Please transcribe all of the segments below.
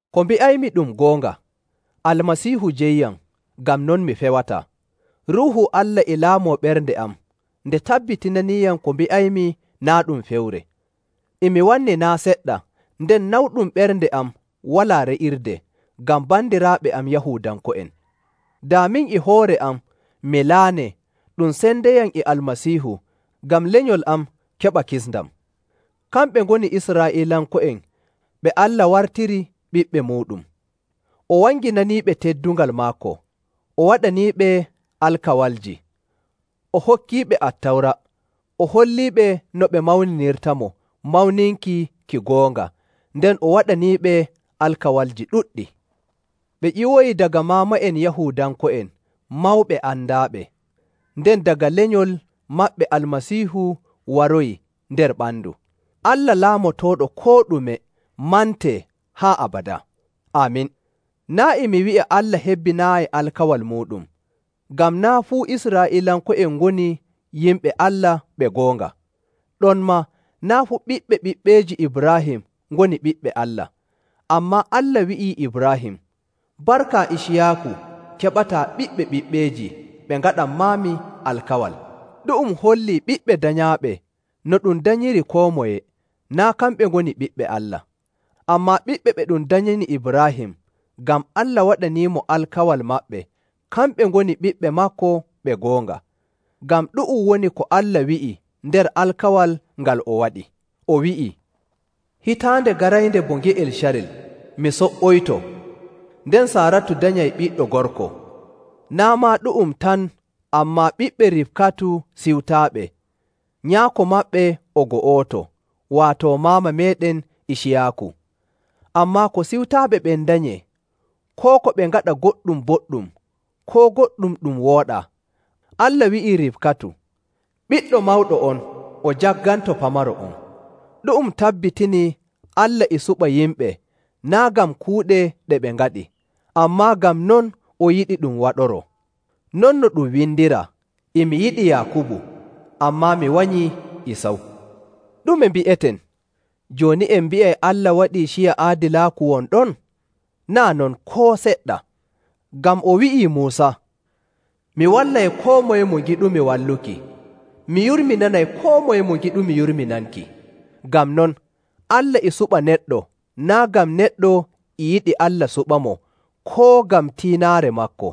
Ko mbi'aymi ɗum goonga. Almasiihu jeyiyam, ngam non mi fewataa. Ruuhu Allah e laamoo ɓernde am nde tabbitinaniiyam ko mbi'aymi naa' ɗum fewre. E mi wannii naa' seɗɗa, nden nawɗum ɓernde am walaa re'irde ngam bandiraaɓe am Yahuudanko'en. Daa min e hoore am mi laanee ɗum sendayam e Almasiihu ngam lenyol am keɓa kisndam. Kamɓe ngoni Israa'iilanko'en, ɓe Allah wartiri ɓiɓɓe muuɗum. O wanginaniiɓe teddungal maako, o waɗaniiɓe alkawalji, o hokkiiɓe Attawra, o holliiɓe no ɓe mawninirtamo mawninki ki goonga, nden o waɗaniiɓe alkawalji ɗuɗɗi.. Ɓe ƴiwoyi daga maama'en Yahuudanko'en mawɓe andaaɓe: Waato Ibraahim, Iciyaaku, Yaakubu, nden daga lenyol maɓɓe Almasiihu waroyi nder ɓandu. Allah laamotooɗo koo ɗume mantee haa abadaa! Aamin. Naa' e mi wi'a Allah hebbinaayi alkawal muuɗum. Ngam naa' fuu Israa'iilanko'en ngoni yimɓe Allah ɓe goonga. Ɗonmaa naa' fuu ɓiɓɓe ɓiɓɓeeji Ibraahim ngoni ɓiɓɓe Allah. Ammaa Allah wi'ii Ibraahim, “Barka Iciyaaku keɓataa ɓiɓɓe ɓiɓɓeeji ɓe ngaɗanmaami alkawal.”. Ɗu'um hollii ɓiɓɓe danyaaɓe no ɗum danyiri koo moye naa' kamɓe ngoni ɓiɓɓe Allah. Ammaa ɓiɓɓe ɓe ɗum danyani Ibraahim ngam Allah waɗaniimo alkawal maɓɓe, kamɓe ngoni ɓiɓɓe maako ɓe goonga. Ngam ɗu'um woni ko Allah wi'i nder alkawal ngal o waɗi, o wi'i, “Hitaande garaynde bo nge'el carel mi so''oyto, nden Saaratu danyay ɓiɗɗo gorko.”. Naa' maa ɗu'um tan, ammaa ɓiɓɓe Rifkatu siwtaaɓe, nyaako maɓɓe o go'oto, waato maama meeɗen Iciyaaku. Ammaa ko siwtaaɓe ɓen ndanyee, koo ko ɓe ngaɗa goɗɗum boɗɗum koo goɗɗum ɗum wooɗaa, Allah wi'ii Rifkatu, “Ɓiɗɗo mawɗo on o jagganto pamaro on.” Ɗu'um tabbitinii Allah e suɓa yimɓe naa' ngam kuuɗe ɗe ɓe ngaɗi, ammaa ngam non o yiɗi ɗum waɗoroo.. Non no ɗum windiraa, “E mi yiɗi Yaakubu, ammaa mi wanyii Isaw.”. Ɗume mbi'eten? Jooni en mbi'ay Allah waɗii ciya aadilaaku won ɗon? Naa' non, koo seɗɗa! Ngam o wi'ii Muusa, “Mi wallay koo moye mo ngiɗumi walluki, mi yurminanay koo moye mo ngiɗumi yurminanki.”. Ngam non, Allah e suɓa neɗɗo naa' ngam neɗɗo e yiɗi Allah suɓamo koo ngam tiinaare maako,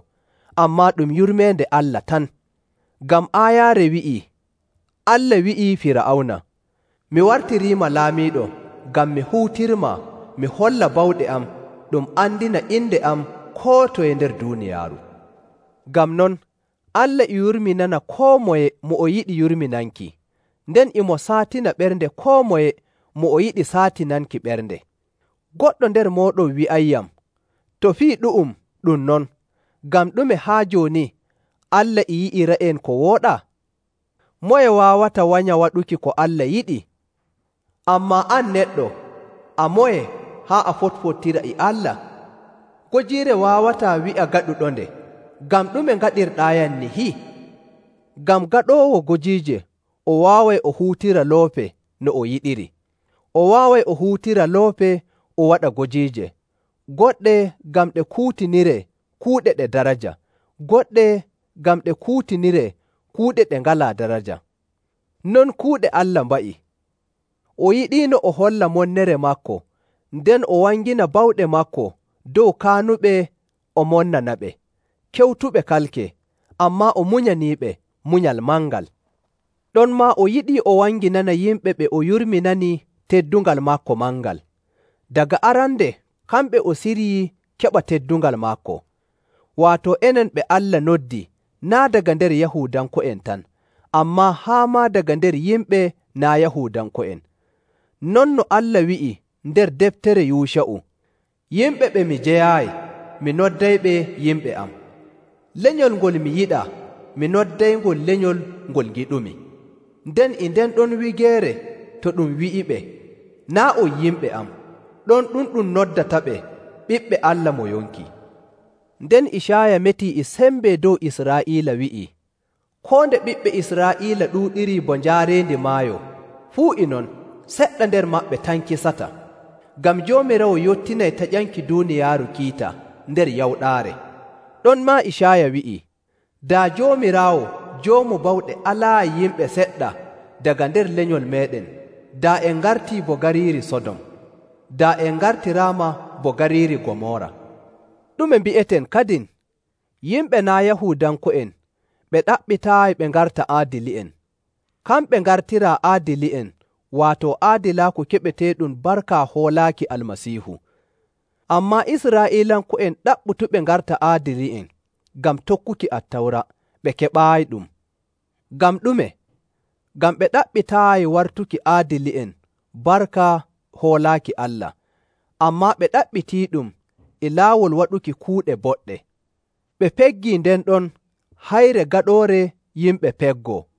ammaa ɗum yurmeende Allah tan. Ngam aayaare wi'ii Allah wi'ii Fir'awna, “Mi wartiriima laamiiɗo ngam mi huutirmaa mi holla bawɗe am ɗum andina inde am koo toye nder duuniyaaru.”. Ngam non, Allah e yurminana koo moye mo o yiɗi yurminanki, nden e mo saatina ɓernde koo moye mo o yiɗi saatinanki ɓernde. Goɗɗo nder mooɗon wi'ayyam, “To fii ɗu'um ɗum non, ngam ɗume haa jooni Allah e yi'ira'en ko wooɗaa? Moye waawata wanya waɗuki ko Allah yiɗi?” Ammaa an neɗɗo, a moye haa a foɗfoɗtira e Allah? Gojiire waawataa wi'a gaɗuɗonde, “Ngam ɗume ngaɗirɗaayam nihi?”. Ngam gaɗoowo gojiije o waaway o huutira loope no o yiɗi. O waaway o huutira loope o waɗa gojiije, goɗɗe ngam ɗe kuutiniree kuuɗe ɗe daraja, goɗɗe ngam ɗe kuutiniree kuuɗe ɗe ngalaa daraja. Non kuuɗe Allah mba'i. O yiɗiino o holla monnere maako, nden o wangina bawɗe maako dow kaanuɓe o monnanaɓe, kewtuɓe kalkee, ammaa o munyaniiɓe munyal mangal. Ɗonmaa o yiɗii o wanginana yimɓe ɓe o yurminani teddungal maako mangal. Daga arande kamɓe o siryii keɓa teddungal maako. Waato enen ɓe Allah noddi naa' daga nder Yahuudanko'en tan, ammaa haa maa daga nder yimɓe naa' Yahuudanko'en. Non no Allah wi'i nder deftere Yuuca'u, “Yimɓe ɓe mi jeyaayi, mi noddayɓe ‘yimɓe am,’ lenyol ngol mi yiɗaa, mi noddayngol, ‘Lenyol ngol ngiɗumi.’. Nden e nden ɗon wigeere to ɗum wi'iɓe, ‘Naa' on yimɓe am,’ ɗon ɗum ɗum noddataɓe ɓiɓɓe Allah mo yonki.”. Nden Icaaya metii e sembe dow Israa'iila wi'i, “Koo nde ɓiɓɓe Israa'iila ɗuuɗirii bo njaareendi maayo, fuu e non seɗɗa nder maɓɓe tan kisata, ngam Joomiraawo yottinay taƴanki duuniyaaru kiita nder yawɗaare.”. Ɗonmaa Icaaya wi'i, “Daa Joomiraawo Joomu Bawɗe alaayi yimɓe seɗɗa daga nder lenyol meeɗen, daa en ngartii bo gariiri Sodom, daa en ngartiraama bo gariiri Gomoora.”. Ɗume mbi'eten kadin? Yimɓe naa' Yahuudanko'en ɓe ɗaɓɓitaayi ɓe ngarta aadili'en, kamɓe ngartiraa aadili'en, waato aadilaaku keɓeteeɗum barka hoolaaki Almasiihu. Ammaa Israa'iilanko'en ɗaɓɓutuɓe ngarta aadili'en ngam tokkuki Attawra, ɓe keɓaayiɗum. Ngam ɗume? Ngam ɓe ɗaɓɓitaayi wartuki aadili'en barka hoolaaki Allah, ammaa ɓe ɗaɓɓitiiɗum e laawol waɗuki kuuɗe boɗɗe. Ɓe peggii nden ɗon “hayre gaɗoore yimɓe peggoo,”